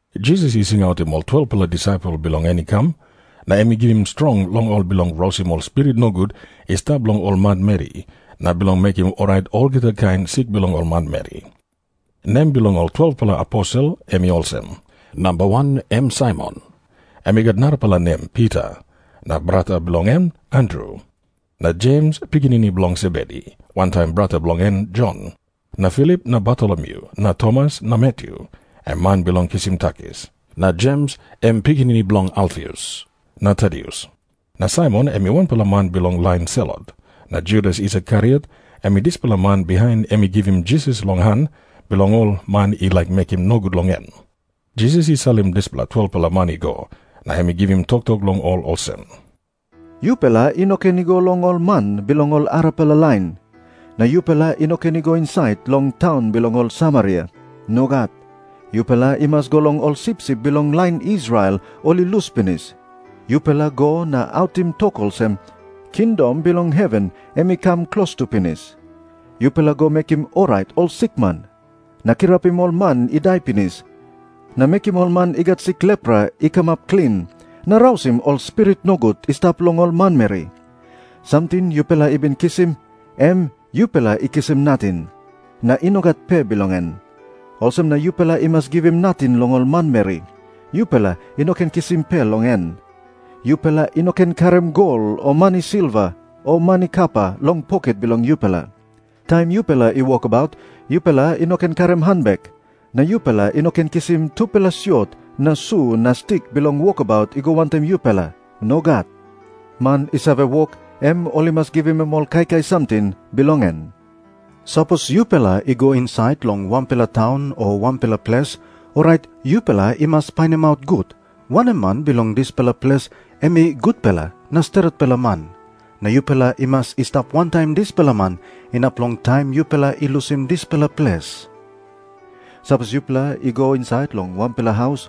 Jisas i singautim ol 12-pela disaipel bilong en i kam, na em i givim strong long ol bilong rausim ol spirit nogut i stap long ol manmeri, na bilong mekim orait olgeta kain sik bilong ol manmeri. Nem bilong ol 12-pela aposel em i olsem. Namba wan em Saimon, em i gat narapela nem Pita, na brata bilong en Andru. Na Jems, pikinini bilong Sebedi, wantaim brata bilong en Jon. Na Filip na Bartolomyu na Tomas na Matyu, em man bilong kisim takis. Na Jems, em pikinini bilong Alfius, na Tadius na Saimon, em wanpela man bilong lain Selot, na Judas Iskariot, em dispela man bihain em i givim Jisas long han bilong ol man i laik mekim nogut long em. Jisas i salim dispela 12-pela man i go, na em i givim toktok long ol olsem, "Yupela i no ken i go long ol man bilong ol arapela lain. Na yupela i no ken i go insait long taun bilong ol Samaria. Nogat. Yupela i mas i go long ol sipsip bilong lain Israel, ol i lus pinis. Yupela go na autim tok olsem, 'Kingdom bilong heven em i kam klostu pinis.' Yupela go mekim orait ol sikman, na kirapim ol man i dai pinis, na mekim ol man i gat sik lepra i kamap klin, na rausim ol spirit nogut i stap long ol manmeri. Samting yupela i bin kisim, em yupela i kisim nating, na i no gat pe bilong en. Olsem na yupela i mas givim nating long ol manmeri. Yupela i no ken kisim pe long en. "Yupela i no ken karim gol o mani silva o mani kapa long poket bilong yupela. Taim yupela i wokabaut yupela i no ken karim hanbek. Na yupela i no ken kisim tupela siot na su na stik bilong wokabaut i go wantaim yupela. Nogat. Man i save wok, em ol i mas givim em ol kaikai samting bilong en. "Sapos yupela i go insait long wanpela taun o wanpela ples, orait yupela i mas painimaut gut, wanem man bilong dispela ples em i gutpela na stretpela man. Na yupela i mas i stap wantaim dispela man inap long taim yupela i lusim dispela ples. Sapos yupela i go insait long wanpela haus,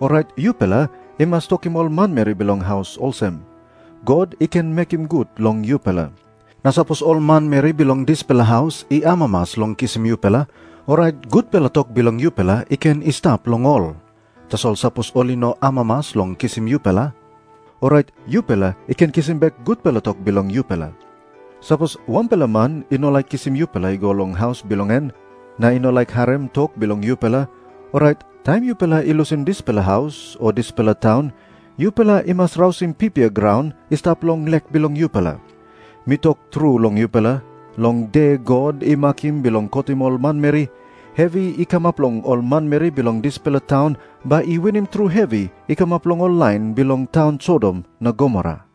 orait yupela i mas tokim ol manmeri bilong haus olsem, 'God i ken mekim gut long yupela.' Na sapos ol manmeri bilong dispela haus i amamas long kisim yupela, orait gutpela tok bilong yupela i ken i stap long ol. Tasol sapos ol i no amamas long kisim yupela, orait yupela i ken kisim bek gutpela tok bilong yupela. Sapos wanpela man i no laik kisim yupela i go long haus bilong en, na i no laik harim tok bilong yupela, orait taim yupela i lusim dispela haus o dispela taun yupela i mas rausim pipia graun i stap long lek bilong yupela. Mi tok tru long yupela, long de God i makim bilong kotim ol manmeri, hevi i kamap long ol manmeri bilong dispela taun bai i winim tru hevi i kamap long ol lain bilong taun Sodom na Gomora."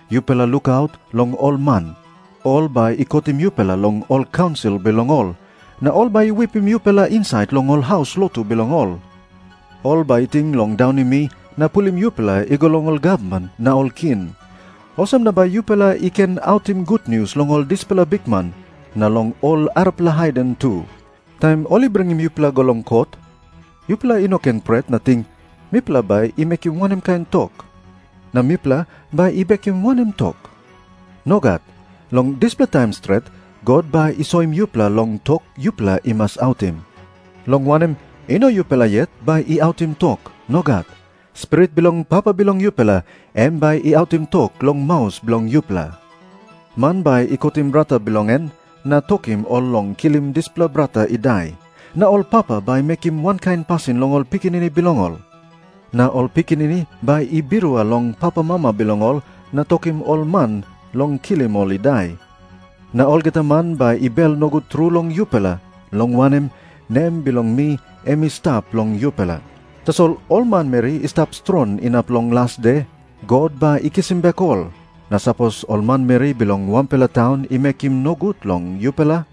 Yupela lukaut long ol man. Ol bai i kotim yupela long ol kaunsil bilong ol, na ol bai i wipim yupela insait long ol haus lotu bilong ol. Ol bai i ting long daunim mi, na pulim yupela i go long ol gavman na ol king. Olsem na bai yupela i ken autim gutnius long ol dispela bikman, na long ol arapela haiden tu. Taim ol i bringim yupela i go long kot, yupela i no ken pret na ting, 'Mipela bai i mekim wanem kain tok? Na mipela bai i bekim wanem tok?' Nogat. Long dispela taim stret God bai i soim yupela long tok yupela i mas autim. Long wanem, i no yupela yet bai i autim tok. Nogat. Spirit bilong Papa bilong yupela, em bai i autim tok long maus bilong yupela. "Man bai i kotim brata bilong en, na tokim ol long kilim dispela brata i dai. Na ol papa bai i mekim wankain pasin long ol pikinini bilong ol. Na ol pikinini bai i birua long papamama bilong ol na tokim ol man long kilim ol i dai. Na olgeta man bai i bel nogut tru long yupela, long wanem, nem bilong mi em i stap long yupela. Tasol ol manmeri i stap strong inap long las de, God bai i kisim bek ol. Na sapos ol manmeri bilong wanpela taun i mekim nogut long yupela,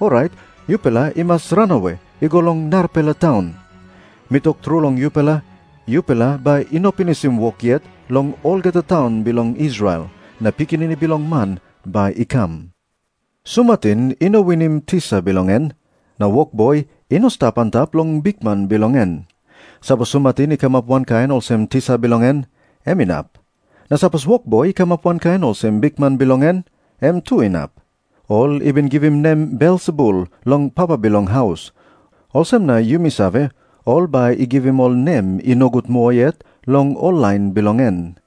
orait yupela i mas ranawe i go long narapela taun. Mi tok tru long yupela, yupela bai i no pinisim wok yet long olgeta taun bilong Israel, na Pikinini Bilong Man bai i kam. "Sumatin i no winim tisa bilong en, na wokboi i no stap antap long bikman bilong en. Sapos sumatin i kamap wankain olsem tisa bilong en, em inap. Na sapos wokboi i kamap wankain olsem bikman bilong en, em tu inap. Ol i bin givim nem Belsebul long papa bilong haus, olsem na yumi save, ol bai i givim ol nem i nogut moa yet long ol lain bilong en."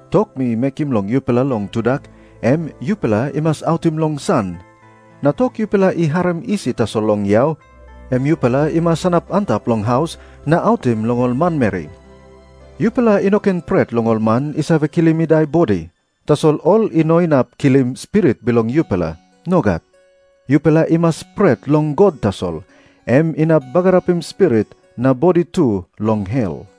Tok mi mekim long yupela long tudak, em yupela i mas autim long san. Na tok yupela i harim isi tasol long yau, em yupela i mas sanap antap long haus na autim long ol manmeri. Yupela i no ken pret long ol man i save kilim i dai bodi, tasol ol i no inap kilim spirit bilong yupela. Nogat. Yupela i mas pret long God tasol. Em inap bagarapim spirit na bodi tu long hel.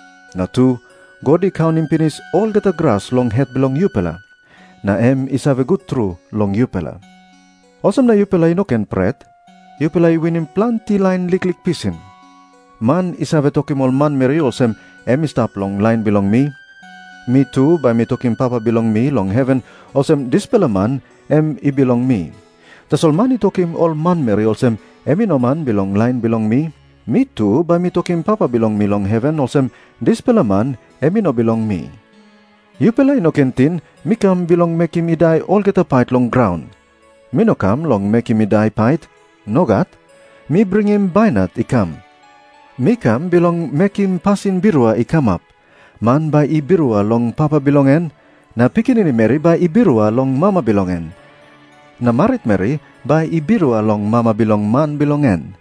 Na tu, God i kaunim pinis olgeta gras long het bilong yupela, na em i save gut tru long yupela. Olsem na yupela i no ken pret. Yupela i winim planti lain liklik pisin." Jisas i tok moa olsem, "Man i save tokim ol manmeri olsem em i stap long lain bilong mi, mi tu bai mi tokim Papa bilong mi long heven olsem dispela man em i bilong mi. Tasol man i tokim ol manmeri olsem em i no man bilong lain bilong mi, mi tu bai mi tokim Papa bilong mi long heven olsem dispela man em i no bilong mi." Jisas i tok moa olsem, "Yupela i no ken ting mi kam bilong mekim i dai olgeta pait long graun. Mi no kam bilong mekim i dai pait. Nogat. Mi bringim bainat i kam. Mi kam bilong mekim pasin birua i kamap. Man bai i birua long papa bilong en, na pikinini meri bai i birua long mama bilong en, na maritmeri bai i birua long mama bilong man bilong en.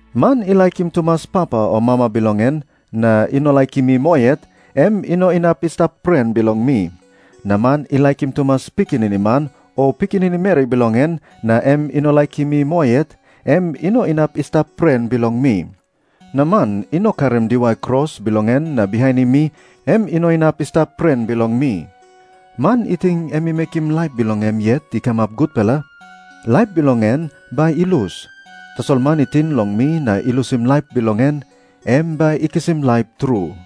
"Man i laikim tumas papa o mama bilong en, na i no laikim mi moa yet, em i no inap i stap pren bilong mi. Na man i laikim tumas pikinini man o pikinini meri bilong en, na em i no laikim mi moa yet, em i no inap i stap pren bilong mi. Na man i no karim diwai kros bilong en na bihainim mi, em i no inap i stap pren bilong mi. Man i ting em i mekim laip bilong em yet i kamap gutpela, laip bilong en bai i lus. Tasol man i ting long mi na i lusim laip bilong en, em bai i kisim laip tru."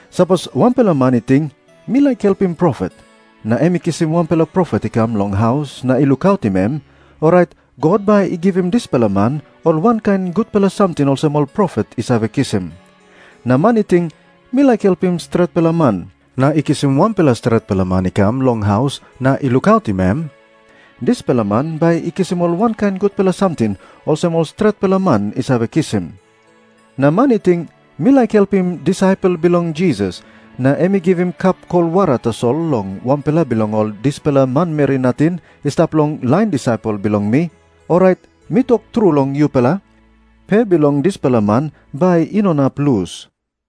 Sapos wanpela man i ting, 'Mi laik helpim profet,' na em i kisim wanpela profet i kam long haus na i lukautim em, orait God bai i givim dispela man ol wankain gutpela samting olsem ol profet i save kisim. Na man i ting, 'Mi laik helpim stretpela man,' na i kisim wanpela stretpela man i kam long haus na i lukautim em, dispela man bai i kisim ol wankain gutpela samting olsem ol stretpela man i save kisim. Na man i ting, 'Mi laik helpim disaipel bilong Jisas,' na em i givim kap kol wara tasol long wanpela bilong ol dispela manmeri nating i stap long lain disaipel bilong mi, orait mi tok tru long yupela, pe bilong dispela man bai i no inap lus."